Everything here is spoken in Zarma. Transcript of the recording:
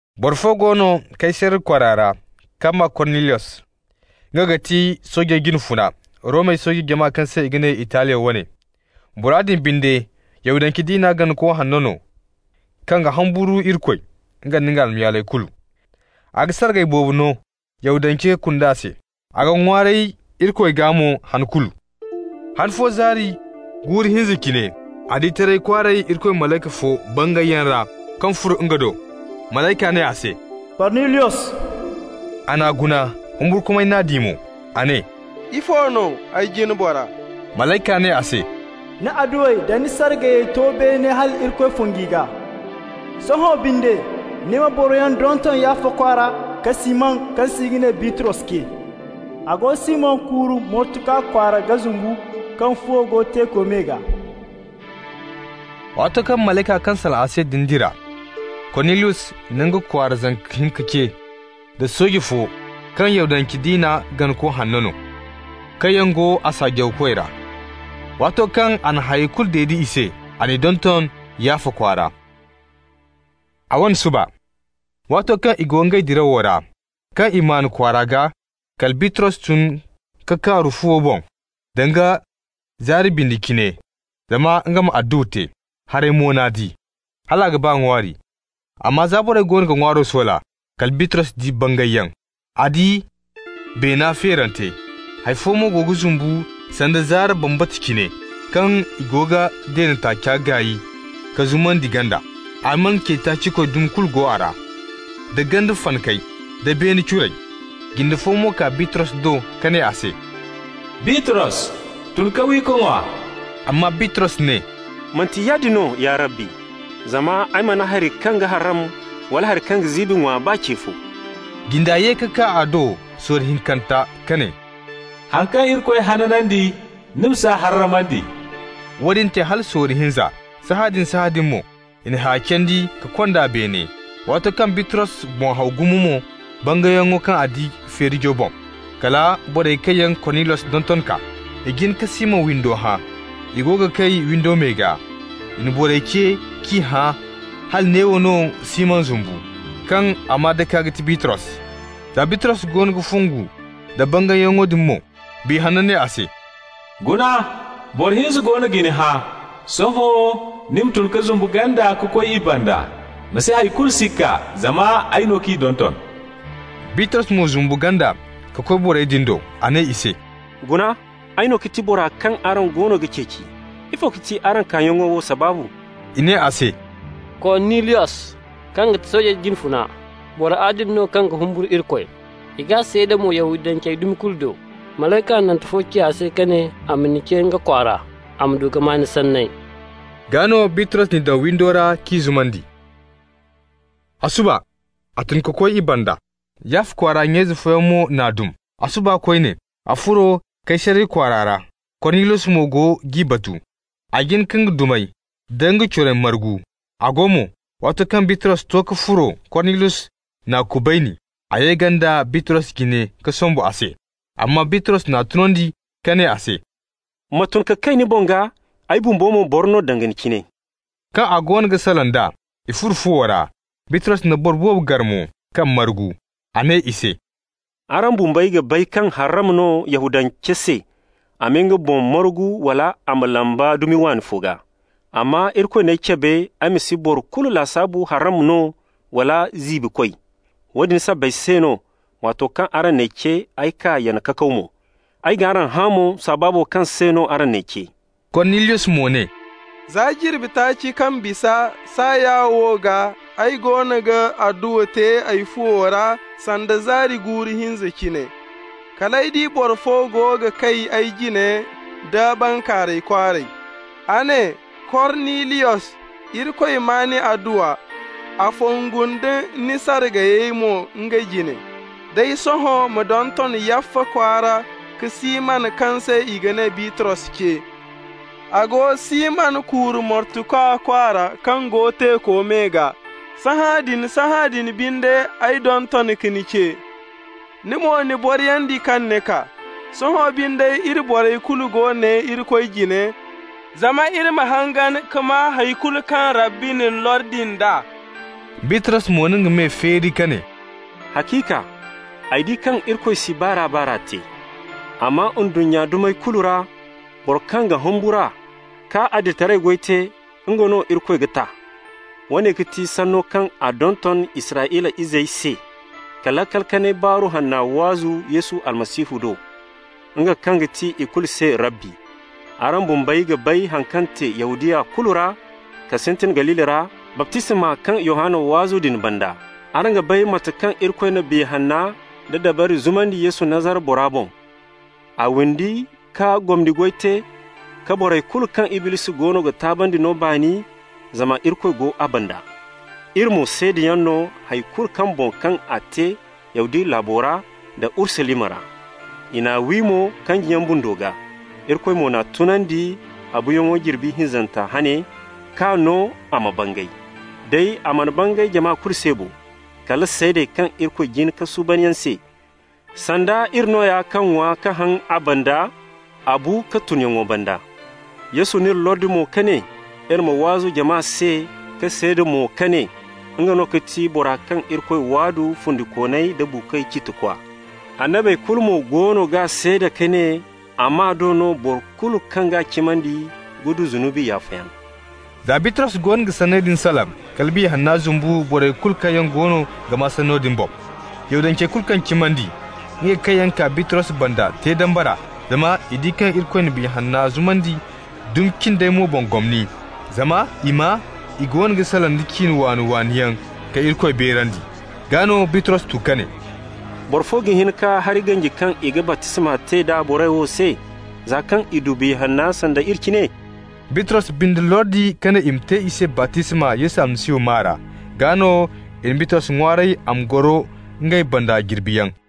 Boro fo go no Kaysariya kwaara ra kaŋ maa Korniliyos. Nga ga ti soojey jine funa, Romey sooje jama kaŋ se i ga ne Italiya wane. Bora din binde Yahudance diina ganako hanno no kaŋ ga humburu Irikoy, nga nda nga almayaaley kulu. A ga sargay boobo no Yahudance kunda se, a ga ŋwaaray Irikoy gaa mo han kulu. Han fo zaari guuru hinza cine, a di taray kwaaray Irikoy malayka fo bangayyaŋ ra kaŋ furo nga do. Malayka ne a se: «Korniliyos!» A n'a guna, humburkumay n'a di mo. A ne: «Ifo no, ay jine bora?» Malayka ne a se: «Ni adduwey da ni sargayey to beene hal Irikoy fongu i gaa. Sohõ binde, ni ma boroyaŋ donton Yaffa kwaara ka Siman, kaŋ se i ga ne Bitros, ce. A go Siman kuuru mortukwa kwaara ga zumbu, kaŋ fuwo go teeko me gaa.» Waato kaŋ malayka kaŋ salaŋ a se din dira, Korniliyos na nga kwaara zanka hinka ce, da sooje fo kaŋ Yahudance diina ganako hanno no, kaŋ yaŋ go a saajawkoy ra. Waato kaŋ a na hayey kulu dede i se, a n'i donton Yaffa kwaara. A wane suba, waato kaŋ i go ngey dirawo ra, kaŋ i maan kwaara gaa, kala Bitros tun ka kaaru fuwo boŋ danga zaari bindi cine, zama nga ma adduwa te. Haray mo n'a di, hal a ga ba ŋwaari. Amma za borey goono ga ŋwaaro soola, kala Bitros di bangayyaŋ. A di beena feerante, hay fo mo go ga zumbu sanda zaara bambata cine, kaŋ i go g'a deene taaca gaay k'a zumandi ganda. Alman ce-taaci-koy dumi kulu go a ra, da ganda fanakey, da beene curey. Jinde fo mo kaa Bitros do ka ne a se: «Bitros, tun ka wi ka ŋwa.» Amma Bitros ne: «Manti yaadin no, ya Rabbi, zama ay mana hari kaŋ ga harram wala kaŋ ga ziibi ŋwa, baa ce fo.» Jinda ye ka kaa a do sorro hinkanta ka ne: «Haŋ kaŋ Irikoy hanandi, ni ma s'a harramandi.» Woodin te hala sorro hinza, sahãadin-sahãadin mo, i na haya candi ka kond'a beene. Waato kaŋ Bitros boŋ haw gumo mo bangayyaŋo kaŋ a di feerijo boŋ, kala borey kaŋ yaŋ Korniliyos donton kaa. I jin ka Siman windo hã. I go ga kay windo me gaa. I na borey ce k'i hã hala neewo no Siman zumbu, kaŋ a maa-dake ga ti Bitros. Za Bitros goono ga fongu nda bangayyaŋo din mo, Biya Hanno ne a se: «Guna, boro hinza goono ga ni hã. Sohõ ni ma tun ka zumbu ganda ka koy i banda. Ma si hay kulu sikka, zama ay no k'i donton.» Bitros mo zumbu ganda ka koy borey din do. A ne i se: «Guna, ay no ga ti bora kaŋ araŋ goono ga ceeci. Ifo ga ti araŋ kaayaŋo wo sabaabu?» I ne a se: «Korniliyos, kaŋ ga ti soojey jine funa, boro adili no kaŋ ga humburu Irikoy, i g'a seeda mo Yahudancey dumi kulu do. Malayka hanante fo ci a se ka ne a ma ni ce nga kwaara, a ma du ka maa ni sanney.» Gaa no Bitros n'i daŋ windo ra k'i zumandi. A suba a tun ka koy i banda. Yaffa kwaara nya-ize fooyaŋ mo n'a dum. A suba koyne a furo Kaysariya kwaara ra, Korniliyos mo go g'i batu. A jin ka nga dumey da nga corey margu. A go mo, waato kaŋ Bitros to ka furo, Korniliyos n'a kubayni. A ye ganda Bitros jine ka sombu a se. Amma Bitros n'a tunandi ka ne a se: «Ma tun ka kay ni boŋ gaa, ay bumbo mo boro no danga ni cine.» Kaŋ a goono ga salaŋ d'a, i furo fuwo ra, Bitros na boro boobo gar mo kaŋ margu. A ne i se: «Araŋ bumbey ga bay kaŋ harram no Yahudance se a ma nga boŋ margu wala a ma lamba dumi waani fo gaa. Amma Irikoy n'ay cabe ay ma si boro kulu lasaabu harram no wala ziibikoy. Woodin sabbay se no, waato kaŋ araŋ n'ay ce ay kaa, yana kakaw mo. Ay g'araŋ hã mo sabaabo kaŋ se no araŋ n'ay ce?» Korniliyos mo ne: «Za jirbi taaci kaŋ bisa, saaya wo gaa, ay goono ga adduwa te ay fuwo ra sanda zaari guuru hinza cine. Kal ay di boro fo go ga kay ay jine nda bankaaray kwaaray. A ne: ‹Korniliyos, Irikoy maa ni adduwa. A fongu nda ni sargayey mo nga jine. Day sohõ, ma donton Yaffa kwaara ka Siman kaŋ se i ga ne Bitros ce. A go Siman kuuru mortukwa kwaara, kaŋ go teeko me gaa.› Sahãadin-sahãadin binde, ay donton ka ni ce. Ni mo, ni boriyandi kaŋ ni kaa. Sohõ binde, iri borey kulu go ne Irikoy jine, zama iri ma hangan ka maa hay kulu kaŋ Rabbi na ni lordi nd'a.» Bitros mo na nga me feeri ka ne: «Haciika, ay di kaŋ Irikoy si baar'a-baar'a te. Amma ndunnya dumey kulu ra, bora kaŋ ga humbur'a ka adilitaray goy te, nga no Irikoy ga ta. Woone ga ti sanno kaŋ a donton Israyla izey se, ka laakal kanay baaru hanna waazu Yesu Almasihu do, nga kaŋ ga ti ikulu se Rabbi. Araŋ bumbey ga bay haŋ kaŋ te Yahudiya kulu ra, ka sintin Galili ra, baptisma kaŋ Yohanna waazu din banda. Araŋ ga bay mate kaŋ Irikoy na Biya Hanna da dabari zumandi Yesu Nazara bora boŋ. A windi ka gomni goy te, ka borey kulu kaŋ Iblisi goono ga taabandi no baani, zama Irikoy go a banda. Iri mo seedayaŋ no hay kulu boŋ kaŋ a te Yahudiya laabo ra da Urusalima ra. I n'a wi mo kanjiyaŋ bundo gaa. Irikoy mo n'a tunandi a buuyaŋo jirbi hinzanta hane, k'a no a ma bangay. Day, a mana bangay jama kulu se bo, kala seedey kaŋ Irikoy jin ka suuban yaŋ se, sanda iri nooya, kaŋ ŋwa ka haŋ a banda a bu ka tunyaŋo banda. Yesu n'iri lordi mo ka ne iri ma waazu jama se ka seeda mo ka ne: Nga no ga ti bora kaŋ Irikoy waadu fundikooney da buukoy ciitikwa. Annabey kulu mo goono g'a seeda ka ne a maa do, boro kulu kaŋ g'a cimandi ga du zunubi yaafayaŋ.» Za Bitros goono ga sanney din salaŋ, kala Biya Hanna zumbu borey kulu kaŋ yaŋ goono ga maa sanno din boŋ. Yahudancey kulu kaŋ cimandi, ngey kaŋ yaŋ kaa Bitros banda te dambara, zama i di kaŋ Irikoy na Biya Hanna zumandi dumi cindey mo boŋ gomni. Zama i maa i goono ga salaŋ da ciine waani-waani yaŋ ka Irikoy beerandi. Gaa no Bitros tu ka ne: «Boro fo ga hin ka hari ganji kaŋ i ga baptisma te d'a borey wo se, za kaŋ i du Biya Hanna sanda iri cine?» Bitros binde lordi ka ne i ma te i se baptisma Yesu Almasihu maa ra. Gaa no i na Bitros ŋwaaray a ma goro ngey banda jirbiyaŋ.